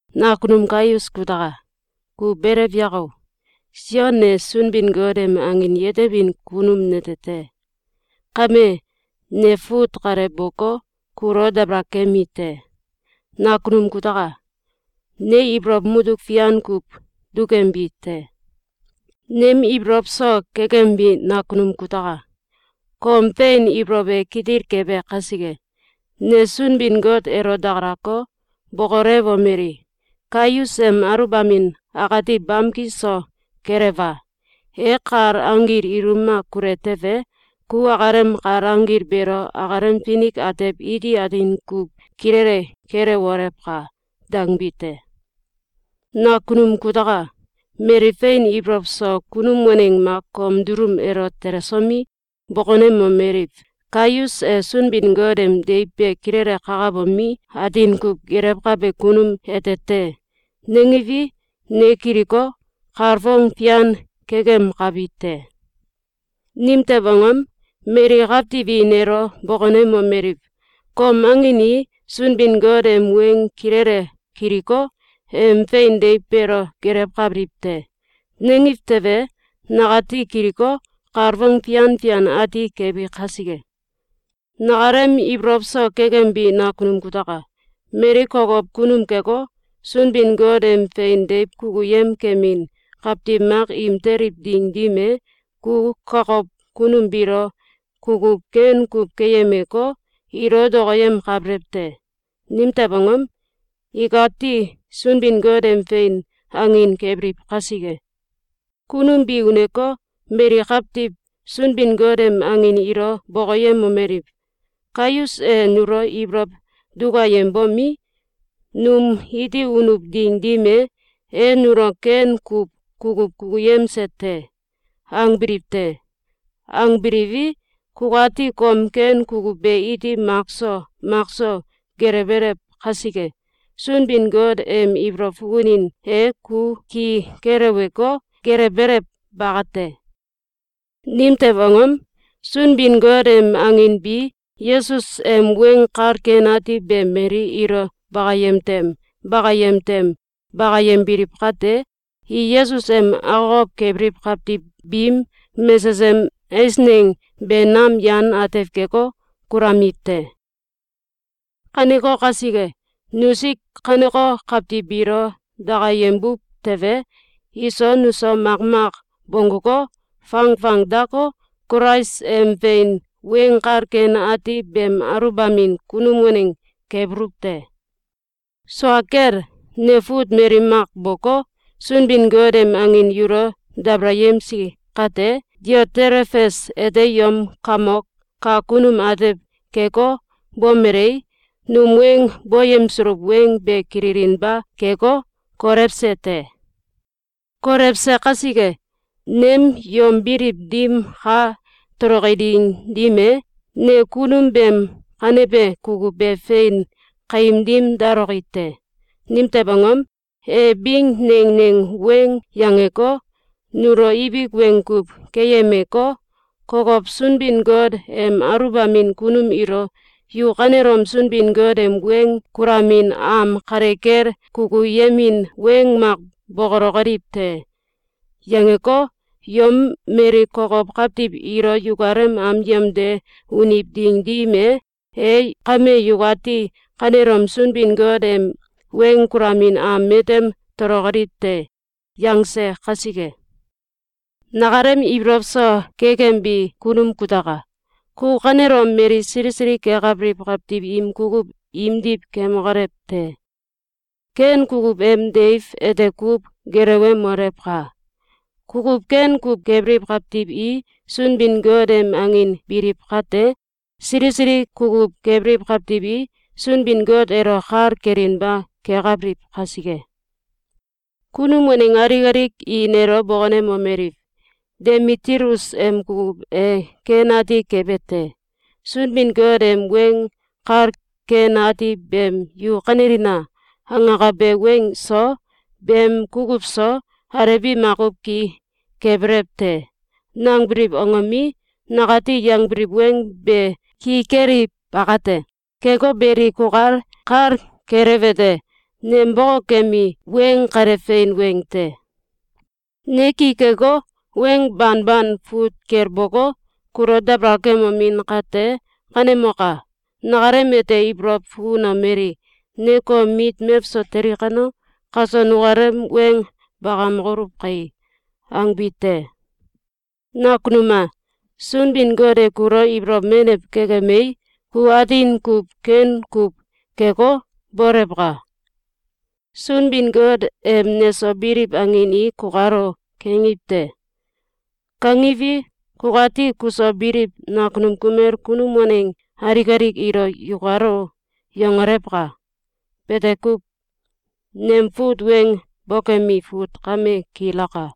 Nakunum Gaius kutaka! Ku belew yako! Sion ne Sunbin-Got em angin yetebin kunum nete te. Kame, ne fut kale boko, kulo dabalakemi te. Nakanum kutaka! Ne ibolow mutuk fian kuw dukembi te. Nem ibolow so kekembi nakunum kutaka! Kom fein ibolow e kitil kebe kasike, ne Sunbin-Got elo dakalako, bokolewomeli: “Gayus em aluwbamin akati bamki so kelewa! E kal anggil ilum mak kule tewe, ku akalem kal anggil beelo akalem finik atew iti atin kuw kilele kelewolewka!”, dangbi te. Nakunum kutaka! Mali fein ibolow so kunum waneng mak kom dulum elo telesomi, bokonemomeliw: “Gayus e Sunbin-Got em deiw be kilele kakabomi, atin kuw gelewkabe kunum ete te!”, nangiwi, ne kiliko, kalfong fian kekemkabi te. Nimtew angom? Mali kawtiw i nelo bokonemomeliw: “Kom angin i Sunbin-Got em weng kilele kiliko, em fein deiw beelo gelewkabiliw te.”, nangiw tewe, nakati kiliko, kalfong fian fian ati kebi kasike. Nakalem ibolow so kekembi nakunum kutaka! Mali kokow kunum keko, Sunbin-Got em fein deiw kukuyem kemin kawtiw mak im teliw ding dim e, ku kakow kunum biilo kukuw ken kuw keyemeko, ilo dokoyemkabelew te. Nimtew angom? Ikati Sunbin-Got em fein angin kebiliw kasike. Kunum bi uneko, mali kawtiw Sunbin-Got em angin ilo bokoyemomeliw: “Gayus e nulo ibolow dukayembomi, num iti unuw ding dim e, e nulo ken kuw kukuw kukuyemse te.”, angbiliw te. Angbiliwi, kukati kom ken kukuw be iti makso makso gelewbelew kasike, Sunbin-Got em ibolow fukunin e ku ki keleweko, gelewbelew bakate. Nimtew angom? Sunbin-Got em angin bi Yesus em Weng Kal Ken Ati be mali ilo bakayem tem bakayem tem bakayembiliw kate, i Yesus em akokow kebiliw kawtiw biim mesesem eisneng be nam yan atew keko, kulamiw te. Kaneko kasike, nusik kaneko kawtiw biilo dakayembuw tewe, iso nuso makmak bongguko, fangfang dako, Kulais em fein Weng Kal Ken Ati beem aluwbamin kunum waneng kebuluw te. Sua kel, ne fut mali mak boko, Sunbin-Got em angin yulo dabalayemsi kate, Diotelefes ete yom kamok kak kunum atew keko, bomelei, num weng boyemsuluw weng be kililinba keko, kolewse te. Kolewse kasike, nem yom biliw dim ka toloki ding dim e, ne kunum beem kanebe kukuw be fein kaim dim daloki te. Nimtew angom? E bing neng neng weng yangeko, nulo ibik weng kuw keyemeko, kokow Sunbin-Got em aluwbamin kunum ilo “Yu kanelom Sunbin-Got em weng kulamin am kale kel kukuyemin weng mak bokolokoliw te!”, yangeko, yom mali kokow kawtiw ilo yukalem am yemde uniw ding dim e, e “Kame yukati kanelom Sunbin-Got em weng kulamin am matem tolokoliw te!”, yangse kasike. Nakalem ibolow so kekembi kunum kutaka! Ku kanelom mali sili sili kekabiliw kawtiw im kukuw imdiw kemokolew te! Ken kukuw em deiw ete kuw gelewemolewka! Kukuw ken kuw kebiliw kawtiw i Sunbin-Got em angin biliw kate, sili sili kukuw kebiliw kawtiw i, Sunbin-Got elo kal kelinba kekabiliw kasike. Kunum waneng alik alik i nelo bokonemomeliw: “Demitilus em kukuw e ken ati kebe te! Sunbin-Got em Weng Kal Ken Ati beem “Yu kanelina!”, angakabe weng so, beem kukuw so, alew bi makuw ki kebelew te!”, nangbiliw angomi, nakati yangbiliw weng be ki keliw bakate. Keko beli, kukal kal kelewete: Nem bokokembi weng kale fein weng te. Ne ki keko, weng banban fut kel boko, kulo dabalakemomin kate, kanemoka! Nakalem ete ibolow fukunomeli: “Ne kom mit mewso teli kano, kaso nukalem weng bakamokoluw kai!”, angbi te. Nakunum a! Sunbin-Got e kulo ibolow menew kekemei, ku atin kuw ken kuw keko, bolewka! Sunbin-Got em neso biliw angin i “Kukalo!”, kangiw te. Kangiwi, kukati kuso biliw nakunum kumel kunum waneng alik alik ilo “Yukalo!”, yangolewka! Bete kuw. Nem fut weng bokemi fut kame kilaka.